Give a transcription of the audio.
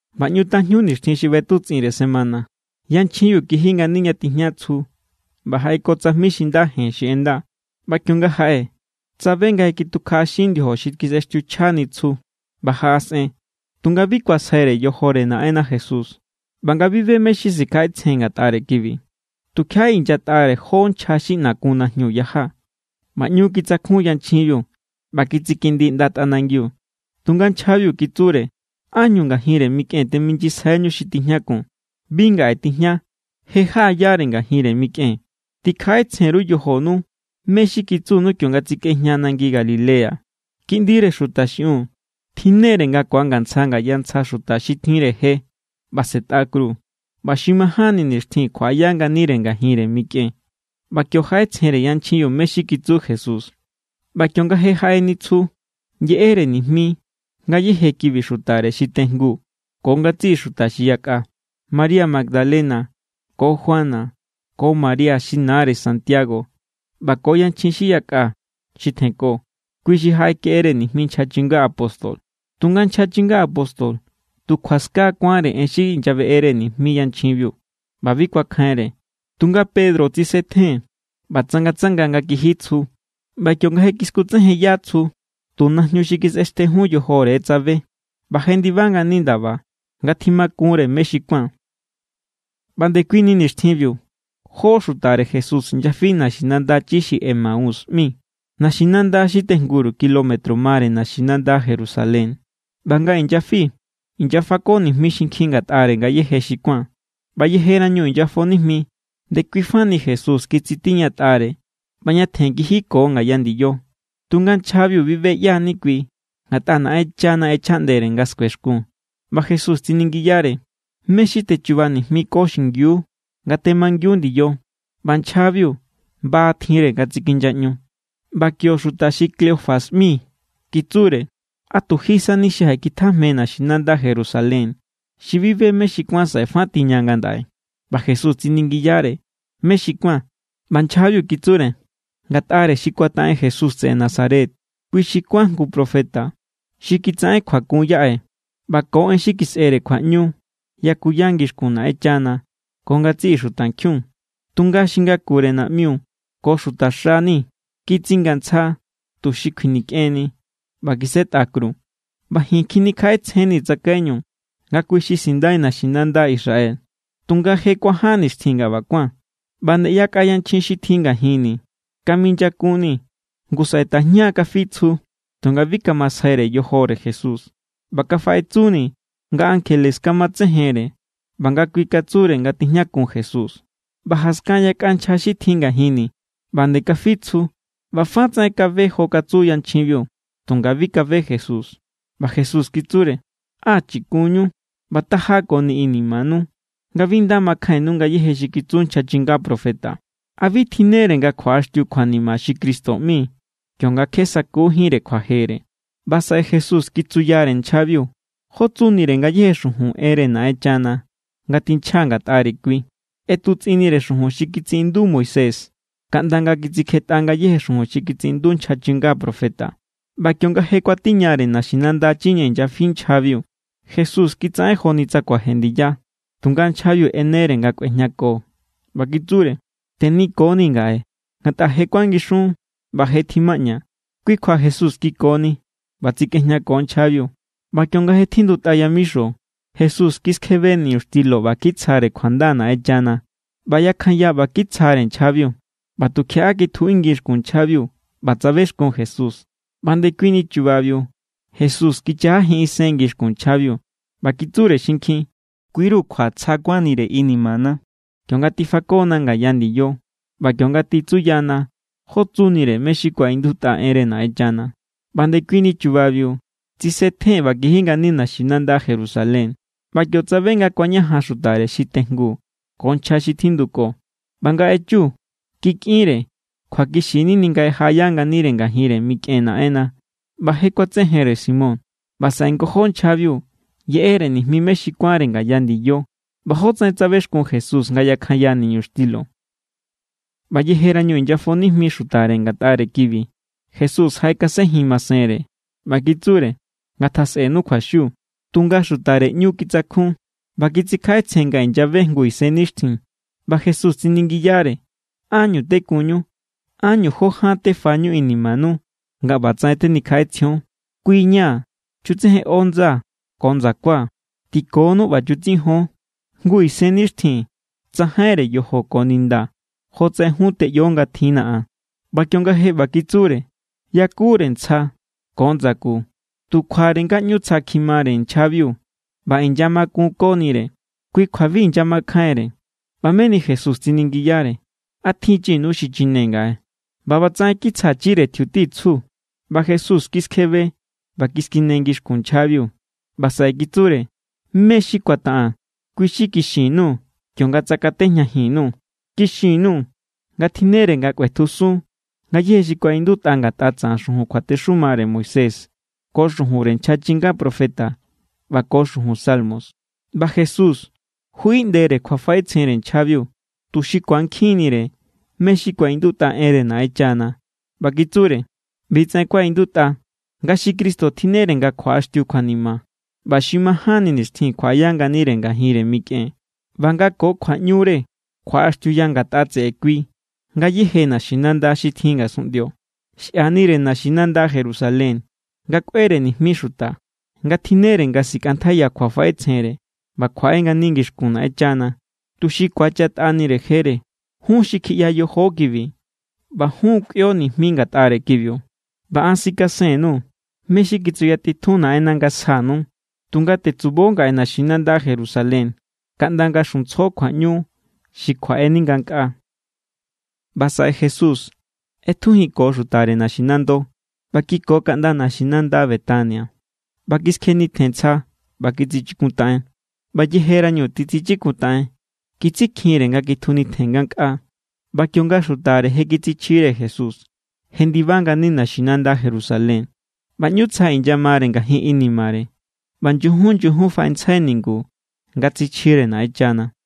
ꞌBa ꞌñu tajñu nixtjin xi ꞌbetutsꞌinre semana, yanchjinbiu kiji ngani ña tijña tsju ꞌba jaꞌeko tsajmi xi nda jen xi ꞌenda. ꞌBa kionga jaꞌe, tsabe nga je kitukjaꞌaxin ndiojo xi kisꞌextiuchjani tsju. ꞌBa jaꞌasꞌen, tunga bi kuasjaire yojore Naꞌenna Jesús. ꞌBa nga bi be mé= xi sikjaꞌetsjen ngatꞌare kibi, tukjiaꞌa inyatꞌare jó nchja xi ꞌna kun najñu yaja. ꞌBa ꞌñu kitsakjun yanchjinbiu ꞌba kitsikindi ꞌnda tꞌanangiu. Tunga nchjabiu kitsure: —¿Ánñu ngajinre mikꞌen teminyisjaiñu xi tijñakun? Bi ngaꞌe tijña. Je jaꞌayare ngajinre mikꞌen. Tikjaꞌetsjen_ru yojonu mé= xi kitsunu kionga tsikꞌejña nangi Galilea: “Kiꞌndire Xuta xiꞌiun tjinnere nga ku̱angantsja ngaya ntsja xuta xi tjinre je, ꞌba sꞌe̱tꞌa kru, ꞌba xi majánni nixtjin kjuaꞌaya nganire ngajinre mikꞌen.” ꞌBa kio jaꞌetsjenre yanchjinbiu mé= xi kitsu Jesús. ꞌBa kionga je jaꞌeni tsju yeꞌere nijmi ngayéje kibi xutare xi tejngu ko ngatsiꞌi xuta xi yakꞌa. María Magdalena ko Juana ko María xi nare Santiago ꞌba ko yanchjin xi yakꞌa xi tjenko, kui xi jaꞌekeꞌere nijmi nchja chinga apóstol. Tunga nchja chinga apóstol tu kjuaska kuánre en xi inyabeꞌere nijmi yanchjinbiu, ꞌba bi kuakjainre. Tunga Pedro tsisetjen ꞌba tsangatsanga nga kiji tsju. ꞌBa kionga kiskutsejenya tsju, tu najñu xi kisꞌextejun yojore= tsabe. ꞌBa jendiba ngani ndaba nga tjimakun=re mé= xi kuán. ꞌBa ndekuini nixtjinbiu jó xutare Jesús inyafi naxinanda chi xi Emaús ꞌmi, naxinanda xi tejnguru kilómetro mare naxinanda Jerusalén. ꞌBa nga inyafi, inyafako nijmi xinkjin ngatꞌare ngayéje xi kuán. ꞌBa yejerañu inyafo nijmi, ndekui fani Jesús kitsitiñatꞌare ꞌba ñatjen kijiko ngaya ndiyo. Tunga nchjabiu bi be ꞌyá= ni kui, ngatꞌa Naꞌenchana ꞌechjaꞌndere nga skuexkun. ꞌBa Jesús tsiningiyare: —¿Mé= xi techuba nijmiko xingiu nga temangiun ndiyo? ꞌBa nchjabiu ba tjinre nga tsikinyaꞌñu. ꞌBa kio xuta xi Cleofas ꞌmi kitsure: —¿A tu ji sani xi jaꞌekitjajme naxinanda Jerusalén xi bi be mé= xi kuán saꞌe fa tiña ngandaꞌe? ꞌBa Jesús tsiningiyare: —¿Mé= xi kuán? ꞌBa nchjabiu kitsure: —Ngatꞌare xi kuataꞌen Jesús tseꞌe Nazaret. Kui xi kuán jngu profeta xi kitsaꞌen kjuakun yaꞌe, ꞌba ko en xi kisꞌere kjuaꞌñu yakuya ngixkun Naꞌenchana ko ngatsiꞌi xutankjiun. Tunga xi ngakure naꞌmiu ko xutaxa ni kitsingantsja, tuxi kjuinikꞌenni, ꞌba kisꞌetꞌa kru. ꞌBa ji̱n kjinikjaꞌetsjee̱n tsakaiñu nga kui= xi sindai naxinanda Israel. Tunga je kuaján nixtjin nga ꞌba kuán. ꞌBa nde yakꞌa yanchjin xi tjin ngajinni̱ kaminyakunni̱. Ngu saꞌe tajña kafi tsju, tunga bi kamasjaire yojore Jesús. ꞌBa kafaꞌetsuni nga ankjele kamatsejenre ꞌba nga kui katsure nga tijñakun Jesús. ꞌBa jaskan yakꞌa nchja xi tjin ngajinni̱ ꞌba nde kafi tsju ꞌba ꞌba fa tsaꞌen kabe jofa katsu yanchjinbiu, tunga bi kabe Jesús. ꞌBa Jesús kitsure: —¡Á chikunñu ꞌba taja koni inimanu nga bi nda makjainnu ngayéje xi kitsu nchja chinga profeta! ¿A bi tjinnere nga kjuaꞌaxtiu kjuanima xi Cristo ꞌmi, kionga kje sa̱kujínre kjuajere? ꞌBa saꞌe Jesús kitsuyare nchjabiu jó tsunire ngayéje xujun enre Naꞌenchana nga tinchja ngatꞌare kui. ꞌEtutsꞌinnire xujun xi kitsiꞌindu Moisés kaꞌnda nga kitsikjetꞌa ngayéje xujun xi kitsiꞌindu nchja chinga profeta. ꞌBa kionga je kuatiñare naxinanda chi ña inyafi nchjabiu, Jesús kitsaꞌen joni tsa kuaje ndiya. Tunga nchjabiu ꞌenere nga kꞌuejñako, ꞌba kitsure: —Tenikonii̱ ngaꞌe, ngatꞌa je kuangixun ꞌba je tjimaꞌña. Kui kjua Jesús kikoni, ꞌba tsikꞌejñako nchjabiu. ꞌBa kionga je tjindutꞌa yamixo, Jesús kiskjebe niñuxtilo ꞌba kitsjare kjuanda Naꞌenchana. ꞌBa yakjanya ꞌba kitsjare nchjabiu. ꞌBa tukjiaꞌa kitjuꞌingi xkun nchjabiu, ꞌba tsabexkun Jesús. ꞌBa ndekuini chubabiu Jesús kichajajin isen ngixkun nchjabiu. ꞌBa kitsure xinkjin: —Kuiru̱ kjua tsja kuánnire inimana kionga tifakona ngaya ndiyo, ꞌba kionga titsuyana jó tsunire mé= xi kuaꞌindutꞌa enre Naꞌenchana. ꞌBa ndekuini chubabiu tsisetjen ꞌba kiji ngani naxinanda Jerusalén, ꞌba kio tsabe nga kuañajan xutare xi tejngu ko nchja xi tjinduko. ꞌBa nga echu, kikꞌinre: —Kjuakixi= nini nga je jaꞌaya nganire ngajinre mikꞌen Naꞌenna ꞌba je kuatsejenre Simón. ꞌBa saꞌe ngojó nchjabiu yeꞌere nijmi mé= xi kuánre ngaya ndiyo ꞌba jótsaꞌen tsabexkun Jesús nga yakjanya niñuxtilo. ꞌBa yejerañu inyafo nijmi xutare ngatꞌare kibi, Jesús jaꞌekasenjin masenre, ꞌba kitsure: —Ngatjasꞌenu kjuaxiu. Tunga xutare ꞌñu kitsakjun, ꞌba kitsikjaꞌetsjen nga inyabe jngu isennixtjin. ꞌBa Jesús tsiningiyare: —¿Ánñu tekunñu? ¿Ánñu jó ján tefañu inimanu nga ꞌbatsaꞌen tenikjaꞌetsjion? Kui= ña̱. Chutsejenꞌo ndsaa̱ ko ndsakua̱. Tikonuu̱ ꞌba chutsijon. Jngu isennixtjin tsajainre yojo ko ninda jotsaꞌen jun teꞌyo nga tjinna̱ an. ꞌBa kionga je ꞌba kitsure, yakure ntsja ko ndsaku. Tu kjuare nga ꞌñu tsja kjimare nchjabiu ꞌba inyamakunkonire, kui kjua bi inyamakjainre. ꞌBa meni Jesús tsiningiyare: —¿A tjinchinu xichina ngaꞌe? ꞌBa ꞌbatsaꞌen kitsjachire tjiuti tsju, ꞌba Jesús kiskjebe ꞌba kiskine ngixkun nchjabiu. ꞌBa saꞌe kitsure: —Mé= xi kuataꞌaa̱n, kui= xi kixin_nuu̱ kionga tsakatejñajin_nuu̱. Kixin_nuu̱ nga tjinnere nga kꞌuetjusun ngayéje xi kuaꞌindutꞌa ngatꞌa tsaꞌan xujun kjuatexumare Moisés ko xujunre nchja chinga profeta ꞌba ko xujun Salmos. ꞌBa Jesús juꞌiꞌndere kjuafaꞌetsjenre nchjabiu, tuxi ku̱ankjinnire mé= xi kuaꞌindutꞌa enre Naꞌenchana. ꞌBa kitsure: —ꞌBitsaꞌen kuaꞌindutꞌa, nga xi Cristo tjinnere nga kjuaꞌaxtiu kjuanima, ꞌba xi majánni nixtjin kjuaꞌaya nganire ngajinre mikꞌen, ꞌba nga ko kjuaꞌñure kjuaꞌaxtiuya ngatꞌa tseꞌe kui ngayéje naxinanda xi tjin ngasunꞌndio. Xꞌianre naxinanda Jerusalén nga kꞌuere nijmi xuta nga tjinnere nga sikꞌantjaiya kjuafaꞌetsjenre ꞌba kjuaꞌe ngani ngixkun Naꞌenchana, tuxi ku̱achatꞌanire jere. Jun xi kjiꞌya yojo kibi, ꞌba jun= kꞌuio nijmi ngatꞌare kibiu. ꞌBa an sikasen_nuu̱ mé= xi kitsutitjun Naꞌenna̱ nga sjanu. Tunga tetsubo ngaꞌe naxinanda Jerusalén kaꞌnda nga̱ xuntsjo kjuaꞌñu xi kjuaꞌeni ngankꞌaa. ꞌBa saꞌe Jesús ꞌetjujinko xutare naxinando, ꞌba kiko kaꞌnda naxinanda Betania. ꞌBa kiskjenitjen ntsja ꞌba kitsichikuntaꞌen. ꞌBa yejerañu titsichikuntaꞌen, kitsikjinre nga kitjunitjen ngankꞌaa. ꞌBa kionga xutare je kitsichjire Jesús, jendiba ngani naxinanda Jerusalén, ꞌba ꞌñu tsja inyamare ngajin inimare. ꞌBa nyujun nyujun faꞌentsjai ningu nga tsichjire Naꞌenchana.